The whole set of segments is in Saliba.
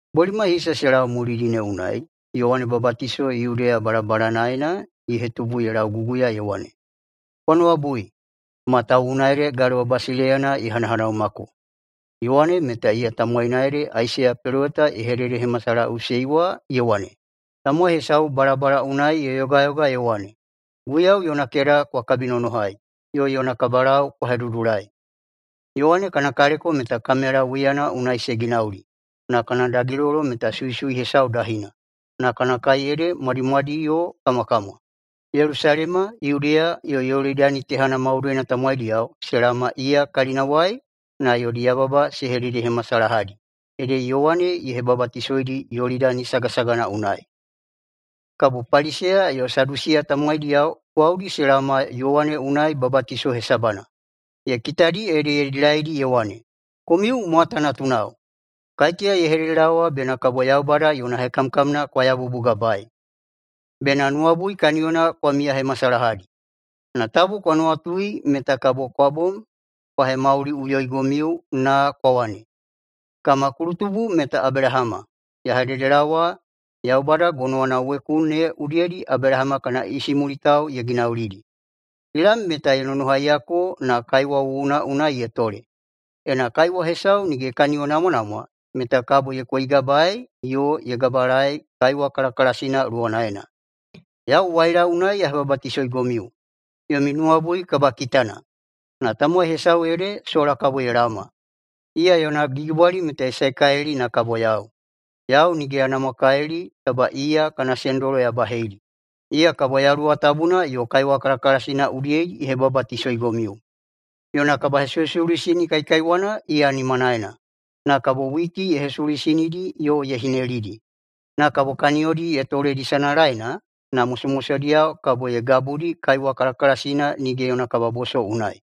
Bolimai hisa se lau mulidi ne unai Yowane Babatiso Yudeya balabalanaena ye hetubu ye lauguguya ye wane, “Kwa nuwabui! Matawuwuna ede Galewa basileiyana ye hanahanaumako!” Yowane meta iya tamowaina ede Aisaiya peloweta ye hededehemasalahaꞌusei wa ye wane, “Tamowai hesau balabala unai ye yogayoga ye wane, ‘Guiyau yona keda kwa kabinonohai, yo yona kabalau kwa hedudulai!’” Yowane kana kaleko meta kamela wiyana unai se ginauli, na kana dagilolo meta suisui hesau dahina, na kana kai ede mwadimwadi yo kamwakamwa. Yelusalema, Yudeya yo Yolidani tehana maudoina tamowaidiyao se laoma iya kalinawai na yodi yababa se hededehemasalahadi, ede Yowane ye hebabatisoidi Yolidani sagasagana unai. Kabo Paliseya yo Sadusiya tamowaidiyao gwaudi se laoma Yowane unai babatiso hesabana. Ye kitadi ede ye dilaidi ye wane, “Komiu mwata natunao! Kaiteya ye hededelaowa bena kabo Yaubada yona hekamkamna kwa yabubugabaei? Bena nuwabui kaniyona kwa miyahemasalahadi! Na tabu kwa nuwatui meta kabo [kwa bom kwa hemauliꞌuyoigomiu na] kwa wane, ‘Kama kulutubu meta Abelahama!’ Ya hededelaowa, Yaubada gonowana weku ne udiyedi Abelahama kana isimulitao ye ginaulidi. Kilam meta ye nonohaiyako na kaiwa wuwuna unai ye tole. Ena kaiwa hesau nige ye kaniyonamwanamwa meta kabo ye koigabaei yo ye gabalaei kaiwa kalakalasina luwanaena. Yau waila unai ya hebabatisoigomiu, yomi nuwabui kabakitana. Na tamowai hesau ede sola kabo ye laoma. Iya yona gigibwali meta ye saekalili na kabo yau. Yau nige ya namwakalili taba iya kana sendolo ya baheidi. Iya kabo Yaluwa Tabuna yo kaiwa kalakalasina udiyedi ye hebabatisoigomiu. Yona kabahesuhesuluisini kaikaiwana iya nimanaena, na kabo witi ye hesuluisinidi yo ye hinelidi. Na kabo kaniyodi ye toledi sanalaena, na mosomosodiyao kabo ye gabudi kaiwa kalakalasina nige yona kababoso unai.”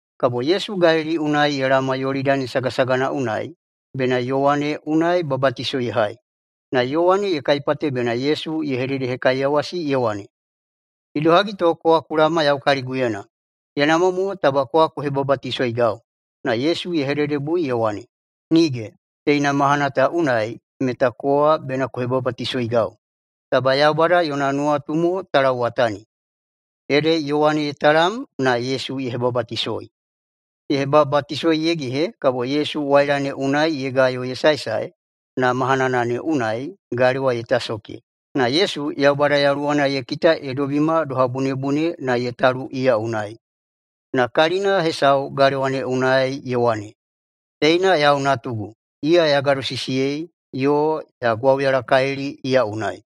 Kabo Yesu Galili unai ye laoma Yolidani sagasagana unai, bena Yowane unai babatiso ye hai. Na Yowane ye kaipate bena Yesu ye hededehekaiyawasi ye wane, “Idohagi to kowa ku laoma yau kaliguyena? Ye namwa mo taba kowa ku hebabatisoigau!” Na Yesu ye hededebui ye wane, “Nige, teina mahana ta unai meta kowa bena ku hebabatisoigau. Taba Yaubada yona nuwatu mo ta lauwatani.” Ede Yowane ye talam na Yesu ye hebabatisoi. Ye hebabatisoi ye gehe kabo Yesu waila ne unai ye gayo ye saesae, na mahanana ne unai galewa ye tasoke, na Yesu Yaubada Yaluwana ye kita ye dobima doha bunebune na ye talu iya unai. Na kalina hesau galewa ne unai ye wane, “Teina yau Natugu. Iya ya gadosisiyei, yo ya gwauyalakalili iya unai.”